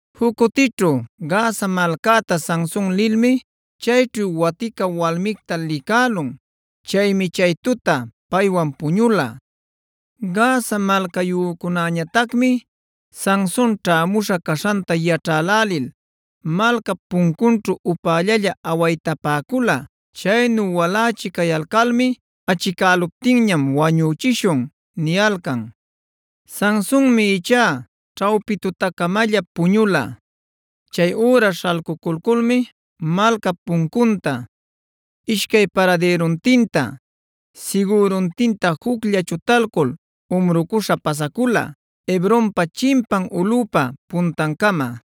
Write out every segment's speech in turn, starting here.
Juc cutićhu Gaza malcäta Sanson lilmi chayćhu watica walmicta licälun. Chaymi chay tuta paywan puñula. Gaza malcayücunäñatacmi Sanson ćhämuśha caśhanta yaćhälälil malcap puncunćhua upällalla awaytapäcula. Chaynu walächi cayalcalmi: “Achicäluptinñam wañüchishun” niyalcan. Sansonmi ichá ćhawpi tutacamalla puñula. Chay üra śhalcuculmi malcap puncunta, ishcay paradïruntinta, sigüruntinta juclla chutalcul umrucuśha pasacula, Hebronpa chimpan ulꞌüpa puntancama.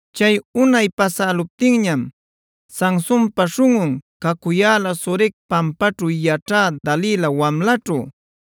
Chay unay pasäluptiñam Sansonpa śhunꞌun cacuyäla Sorec pampanćhu yaćhä Dalila wamlaćhu.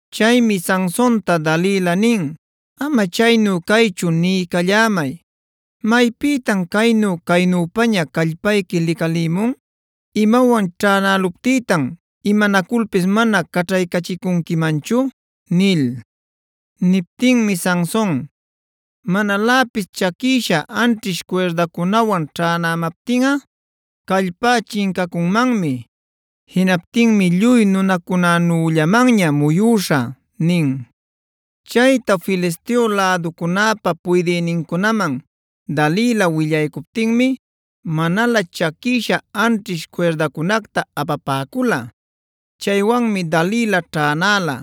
Chaymi Sansonta Dalila nin: “Ama chaynu caychu niycallämay, ¿maypïtan caynu-caynüpaña callpayqui licalimun? ¿Imawan ćhänäluptïtan imanaculpis mana caćhaycachicunquimanchu?” nil. Niptinmi Sanson: “Manaläpis chaquïsha anćhish cuirdacunawan ćhänämaptinꞌa callpá chincacunmanmi. Jinaptinmi lluy nunacunänüllamanña muyüśhä” nin. Chayta Filisteo läducunäpa puydïnincunaman Dalila willaycuptinmi manalä chaquïsha anćhish cuirdacunacta apapäcula. Chaywanmi Dalila ćhänäla.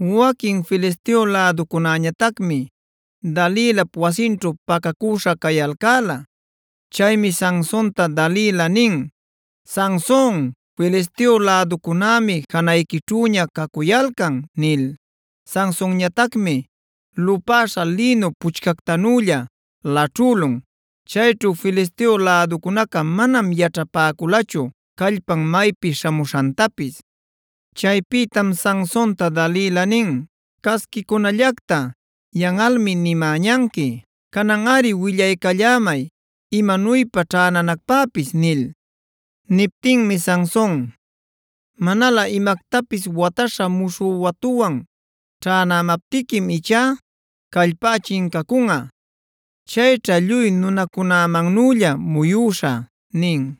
Waquin Filisteo läducunäñatacmi Dalilap wasinćhu pacacüśha cayalcäla. Chaymi Sansonta Dalila nin: “¡Sanson, Filisteo läducunämi janayquićhüña cacuyalcan!” nil. Sansonñatacmi lupäśha lïnu puchcactanülla laćhülun.b Chayćhu Filisteo läducunaca manam yaćhapäculachu callpan maypi śhamuśhantapis. Chaypïtam Sansonta Dalila nin: “Casquicunallacta, yanꞌalmi nimäñanqui. Cananꞌari willaycallämay, ¿imanuypa ćhänanacpäpis?” nil. Niptinmi Sanson: “Manalä imactapis wataśha muśhü watuwan ćhänämaptiquim ichá callpá chincacunꞌa. Chayćha lluy nunacunämannülla muyüśhä” nin.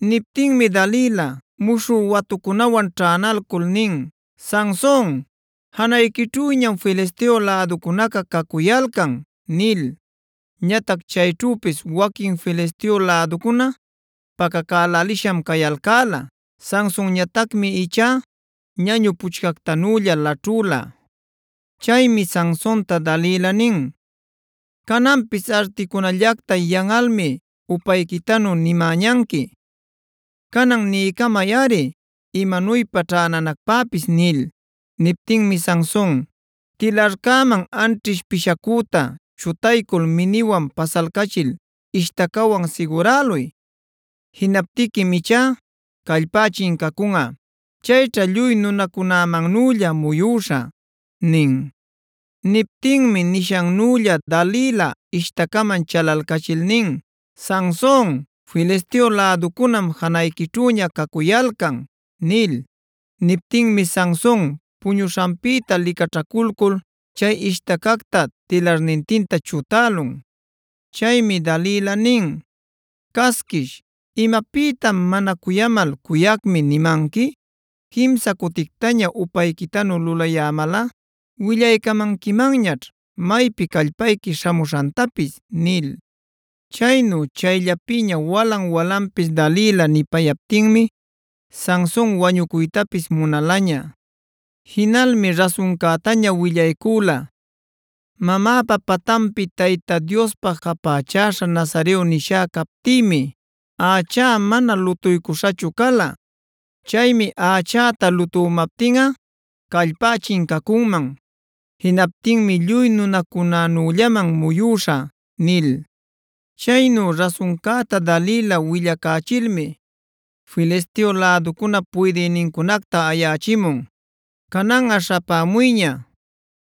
Niptinmi Dalila muśhü watucunawan ćhänalcul nin: “¡Sanson, janayquićhüñam Filisteo läducunaca cacuyalcan!” nil. Ñatac chayćhüpis waquin Filisteo läducuna pacacälälisham cayalcäla. Sansonñatacmi ichá ñañu puchcactanülla laćhüla. Chaymi Sansonta Dalila nin: “Cananpis articunallacta yanꞌalmi upayquitanu nimäñanqui. Canan niycamayꞌari imanuypa ćhänanacpäpis” nil. Niptinmi Sanson: “Tilarcäman anćhish pishacüta chutaycul mininwan pasalcachil ishtacawan siguräluy. Jinaptiquim ichá callpá chincacunꞌa. Chayćha lluy nunacunämannülla muyüśhä” nin. Niptinmi nishannülla Dalila ishtacaman chalalcachil nin: “¡Sanson, Filisteo läducunam janayquićhüña cacuyalcan!” nil. Niptinmi Sanson puñuśhanpïta licaćhaculcul chay ishtacacta tilarnintinta chutälun. Chaymi Dalila nin: “¡Casquish! ¿Imapïtam mana cuyamal ‘cuyacmi’ nimanqui? Quimsa cutictaña upayquitanu lulayämalꞌa willaycamanquimanñaćh maypi callpayqui śhamuśhantapis” nil. Chaynu chayllapïña walan-walanpis Dalila nipayaptinmi Sanson wañucuytapis munalaña. Jinalmi rasuncätaña willaycüla: “Mamäpa patanpi Tayta Diospä japächäśha nazareo nisha captïmi, ächá mana lutuycuśhachu cala. Chaymi ächäta lutümaptinꞌa callpá chincacunman. Jinaptinmi lluy nunacunänüllaman muyüśhä” nil. Chaynu rasuncäta Dalila willacächilmi Filisteo läducunap puydïnincunacta ayächimun: “Cananꞌa śhapämuyña;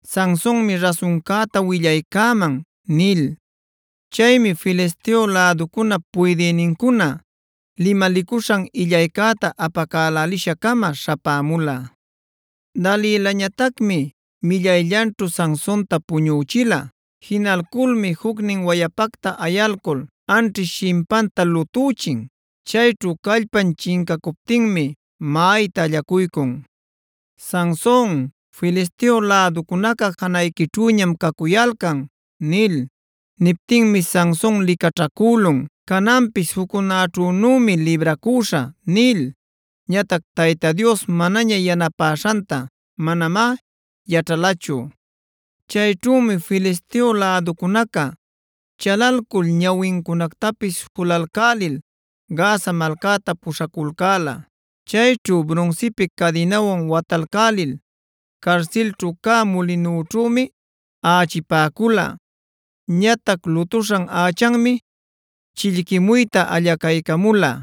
Sansonmi rasuncäta willaycäman” nil. Chaymi Filisteo läducunap puydïnincuna limalicuśhan illaycäta apacälälisha-cama śhapämula. Dalilañatacmi millayllanćhu Sansonta puñüchila. Jinalculmi jucnin wayapacta ayalcul anćhish shimpanta lutüchin. Chayćhu callpan chincacuptinmi maꞌayta allacuycun: “Sanson, Filisteo läducunaca janayquićhüñam cacuyalcan” nil. Niptinmi Sanson licaćhacülun: “Cananpis juccunäćhünümi libracüśhä” nil. Ñatac Tayta Dios manaña yanapäśhantá manamá yaćhalachu. Chayćhümi Filisteo läducunaca chalalcul ñawincunactapis julalcälil Gaza malcäta puśhaculcäla. Chayćhu brunsipi cadinawan watalcälil carsilćhu cä mulinućhümi aꞌachipäcula. Ñatac lutuśhan ächanmi chillquimuyta allacaycamula.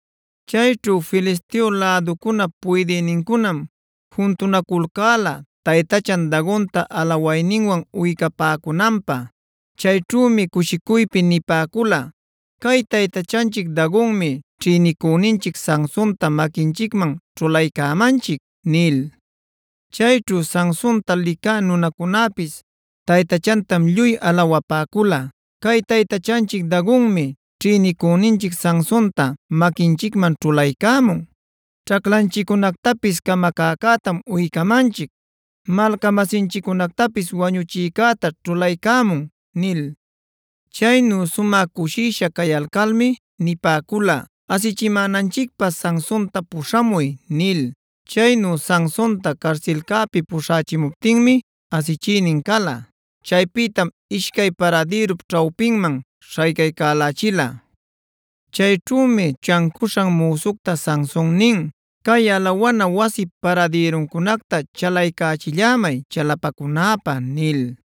Chayćhu Filisteo läducunap puydïnincunam juntunaculcäla taytachan Dagonta alawayninwan uycapäcunanpä. Chayćhümi cushicuypi nipäcula: “Cay taytachanchic Dagonmi ćhïnicüninchic Sansonta maquinchicman ćhulaycämanchic” nil. Chayćhu Sansonta licä nunacunäpis taytachantam lluy alawapäcula: “Cay taytachanchic Dagonmi ćhïnicüninchic Sansonta maquinchicman ćhulaycämun; ćhaclanchicunactapis camacäcätam uycämanchic, malca-masinchiccunactapis wañuchïcäta ćhulaycamun” nil. Chaynu sumä cushisha cayalcalmi nipäcula: “Asichimänanchicpä Sansonta puśhamuy” nil. Chaynu Sansonta carsilcäpi puśhächimuptinmi asichïnin cala. Chaypïtam ishcay paradïrup ćhawpinman śhaycaycälächila. Chayćhümi chancuśhan müsucta Sanson nin: “Cay alawana wasip paradïruncunacta chalaycächillämay chalapacunäpä” nil.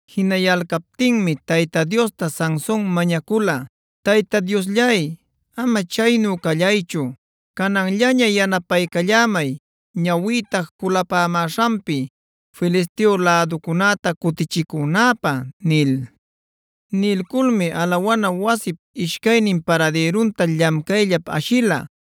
Jinayalcaptinmi Tayta Diosta Sanson mañacula: “Tayta Diosllay, ama chaynu callaychu, cananllaña yanapaycallämay ñawïta julapämäśhanpi Filisteo läducunäta cutichicünäpä” nil. Nilculmi alawana wasip ishcaynin paradïrunta llamcayllap ashila.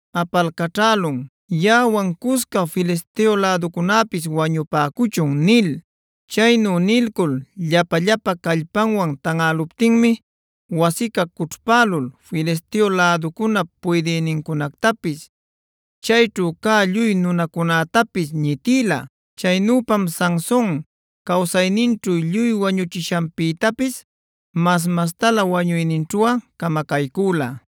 apalcaćhälun: “Yaꞌawan cusca Filisteo läducunäpis wañupäcuchun” nil. Chaynu nilcul llapa-llapa callpanwan tanꞌäluptinmi wasica cućhpälul Filisteo läducunap puydïnincunactapis, chayćhu cä lluy nunacunätapis ñitïla. Chaynüpam Sanson cawsayninćhu lluy wañuchishanpïtapis mas-mastalä wañuyninćhuꞌa camacaycüla.